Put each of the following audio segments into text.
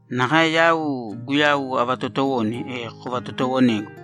Nakae yau Guyau avatootowone, e kovatotowonēgu.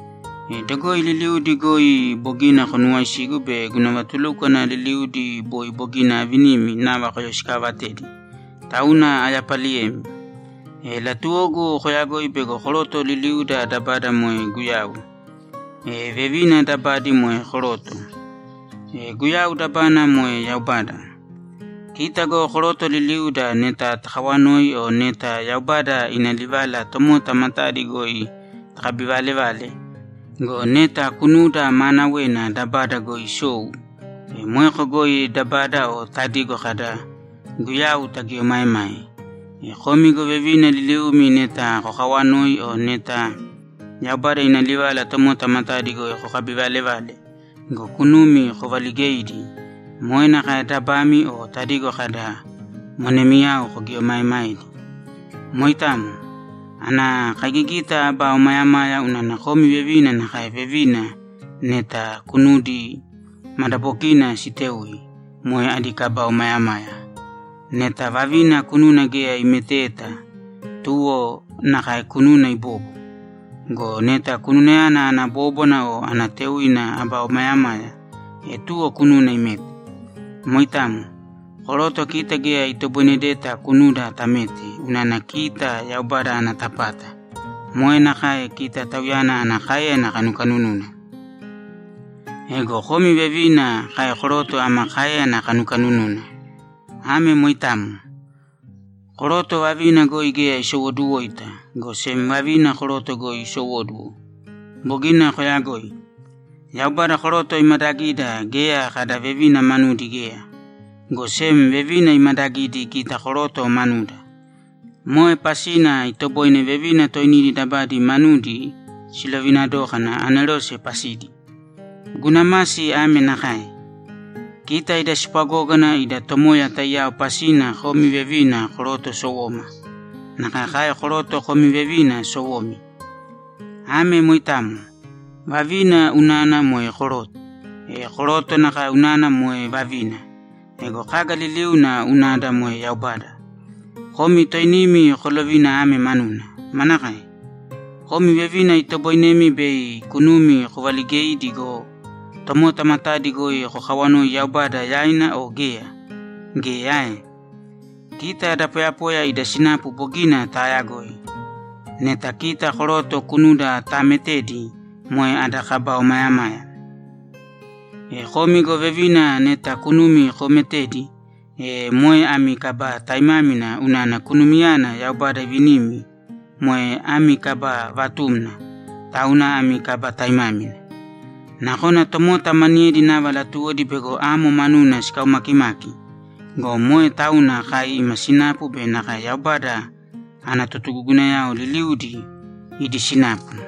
E dogoi liliudi goi bogina konuwaisigu be guna vatulúkwana liliudi boi bogina aavinimi nava koyoisikaavatedi, tauna ayapaliyemi. E latuwogu koyagoi bego koroto liliuda dabada moe Guyau. E vevina dabadi moe koroto. E Guyau dabana moe Yaubada. Kita go koroto liliuda neta takawanoi o neta Yaubada ina livala tomota matadi goi takabivalevale go, neta kunuda maanawena dabada goi isou, e moeko goi dabada o tadigo kada, ‘Guyau’, tagieomaemae. E komi go vevina liliumi neta kokawanoi o neta Yaubada ina livala tomota matadi goi kokabivalevale go, kunumi kovaligeidi, moe nakae dabami o tadigo kada, ‘Monemiyao’, kogieomaemaedi. Moitamo. Ana kaigigita aba omayamaya unana komi vevina nakae vevina neta kunudi madabokiina sitéui moe adi kaba omayamaya. Neta vavina kununa geya imeteta, tuwo nakae kununa ibōbo. Go neta kununayana ana bóbwana o ana téuina aba omayamaya, e tuwo kununa imēte. Moitamo. Koroto kita geya itoboinedeta kunuda tamete unana kita Yaubada ana tapata, moe nakae kita Tauyana ana káeyana kanukanununa. Ego komi vevina kai koroto ama káeyana kanukanununa. Ame moitamo. Koroto vavina goi geya isowoduwoita, go sem vavina koroto goi isowóduwo. Bogina koyagoi. Yaubada koroto imadagida geya kada vevina manudi geya, go sem vevina imadagidi kita koroto manuda. Moe pasina itoboine vevina toinidi dabadi manudi silovina dókana anerose pasidi. Guna masi ame nakae: Kita ida spwagógana ida Tomoya taiyao pasina komi vevina koroto sowoma. Nakae kai koroto komi vevina sowomi. Ame moitamo. Vavina unana moe koroto, e koroto nakae unana moe vavina. Ego kaga liliuna unada moe Yaubada. Komi toinimi kolovīna ame manuna: Manakae? Komi vevina itoboinemi bei kunumi kovaligeidi go, tomota matadi goi kokawanoi Yaubada yaina o geya? Geya ae? Kita da poyapoya ida sinapu bogina taayagoi. Neta kita koroto kunuda taametedi, moe ada kaba omayamaya. E komi go vevina neta kunumi koometedi, e moe ami kaba taimámina unana kunumiyana Yaubada ivinimi moe ami kaba vatumna, tauna ami kaba taimámina. Nakona tomota maniyedi nava latuwodi bego amo manuna sikaumakimaki go, moe tauna kai ima sinapu be nakae Yaubada ana totugugunayao liliudi idi sinapu.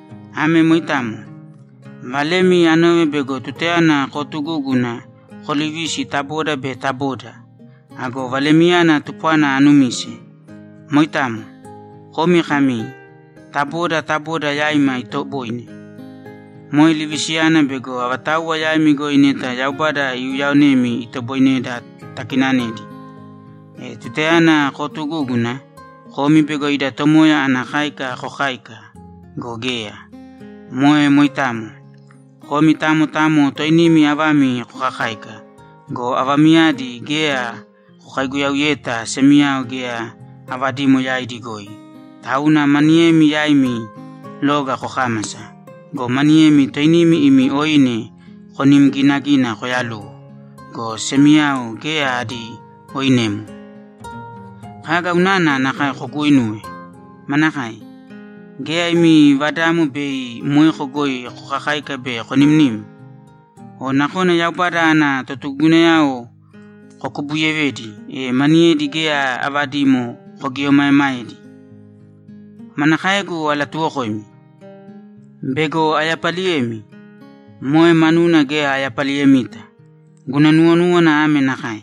Ame moitamo. Valemi anove bego tutayana kootugúguna, koolivisi ta boda be ta boda. Ago valemiyana tupwana anumise. Moitamo. Komi kami, ‘Ta boda ta boda yaima itoboine.’ Moe livisiyana bego avatauwa yaimi goi neta Yaubada iuyaonemi itoboineda takinanedi! E tutayana kootugúguna, komi bego ida Tomoya ana káika kokáika go, geya. Moe moitamo. Komi tamo tamo toinimi avami kokakáika go, avamiyadi geya kokaiguyauyeta semiyao geya avadimo yaidi goi, tauna maniyemi yaimi loga kokámasa go, maniyemi toinimi imi oine konim ginagina koyaluwo go, semiyao geya adi oinemo! Kaga unana nakae koguuinuwe? Manakae? Geya imi vadamo bei moeko goi kokakáika be konimnim? O nakona Yaubada ana totugugunayao kokubuyevedi, e maniyedi geya avadimo kogieomaemaedi. Manakaegu alatuwokoimi? Bego ayapaliyemi? Moe manuna geya ayapaliyemita! Guna nuwonúwana ame nakae: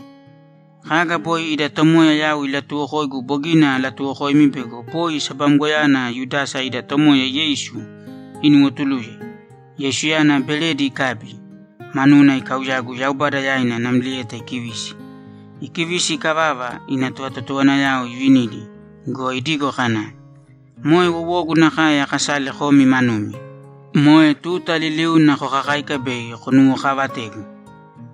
Kaga boi ida Tomoya yau ilatuuwokoigu bogina alatuwokoimi bego boi sabamgoyana Yudasa ida Tomoya Yeisu inuwotuluye, Yeisuyana beredi ikabi, manuna ikauyagu Yaubada yaina namlieta ikivisi. Ikivisi ikavava, ina tovatotowanayao ivinidi go, idigo kana, ‘Moe wowogu nakae akasale komi manumi. Moe tuta liliuna kokakāika bei konuwokaavategu.’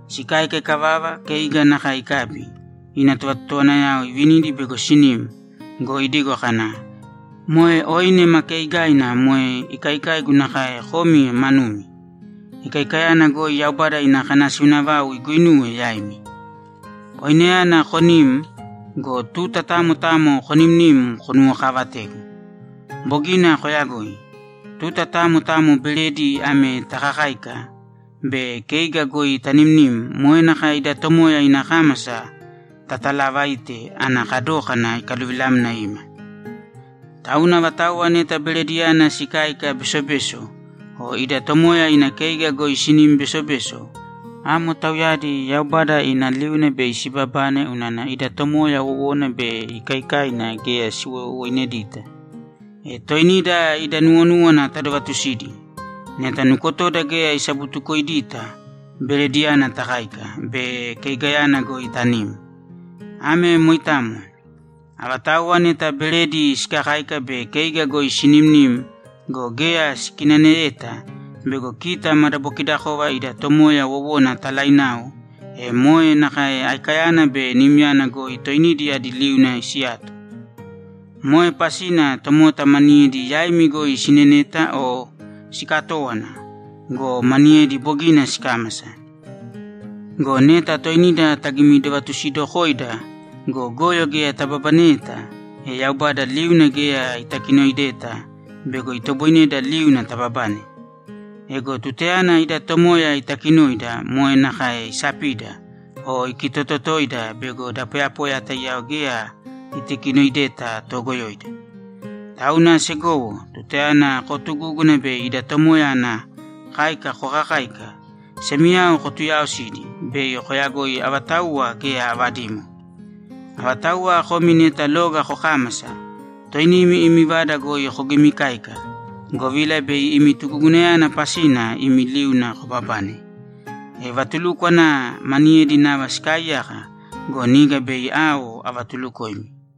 Sikáika ikavava, keiga nakae ikabi, ina tovatotowanayao ivinidi bego sinim go, idigo kana, ‘Moe oine ma keigaina moe ikaikaigu nakae komi manumi. Ikaikayana goi Yaubada ina kanasiuna vau iguinuwe yaimi. Oineyana konīm go, tuta tamo tamo konimnīm, konuwokaavatēgu.’ Bogina koyagoi. Tuta tamo tamo beredi ame takakáika be keiga goi tanimnim, moe nakae ida Tomoya ina kámasa tatalavaite ana kadókana ikaluvilamna ima. Tauna avatauwa neta berediyana sikáika besobeso o ida Tomoya ina keiga goi sinim besobeso, amo tauyadi Yaubada ina liuna bei sibabane unana ida Tomoya wowona be ikaikaina geya siwowoinedita. E toinida ida nuwonúwana tadovatusīdi. Neta nukotoda geya isabutukoidita, berediyana takáika be keigayana goi tanim. Ame moitamo. Avatauwa neta beredi sikakáika be keiga goi sinimnim go, geya sikinaneyeta bego kita madabokidakova ida Tomoya wowona talainao, e moe nakae aikayana be nimyana goi toinidi adi liuna siyato. Moe pasina tomota maniyedi yaimi goi sineneta o sikatówana go, maniyedi bogina sikámasa. Go neta toinida tagimidovatusidokoida go, goyo geya tababaneyeta, e Yaubada liuna geya itakinoideta bego itoboineda liuna tababane. Ego tutayana ida Tomoya itakinoida, moe nakae isapida o ikitototoida bego da poyapoya taiyao geya itakinoideta toogoyoida. Tauna segowo, tutayana kootugúguna bei ida Tomoya ana káika kokakáika, semiyao kotuyaosīdi bei koyagoi avatauwa geya avadimo. Avatauwa komi neta loga kokámasa, toinimi imi vada goi kogimikāika, govila bei imi tugugunayana pasina imi liuna kobabane. E vatulúkwana maniyedi nava sikaaiyaka go, niga bei ao avatulukoimi.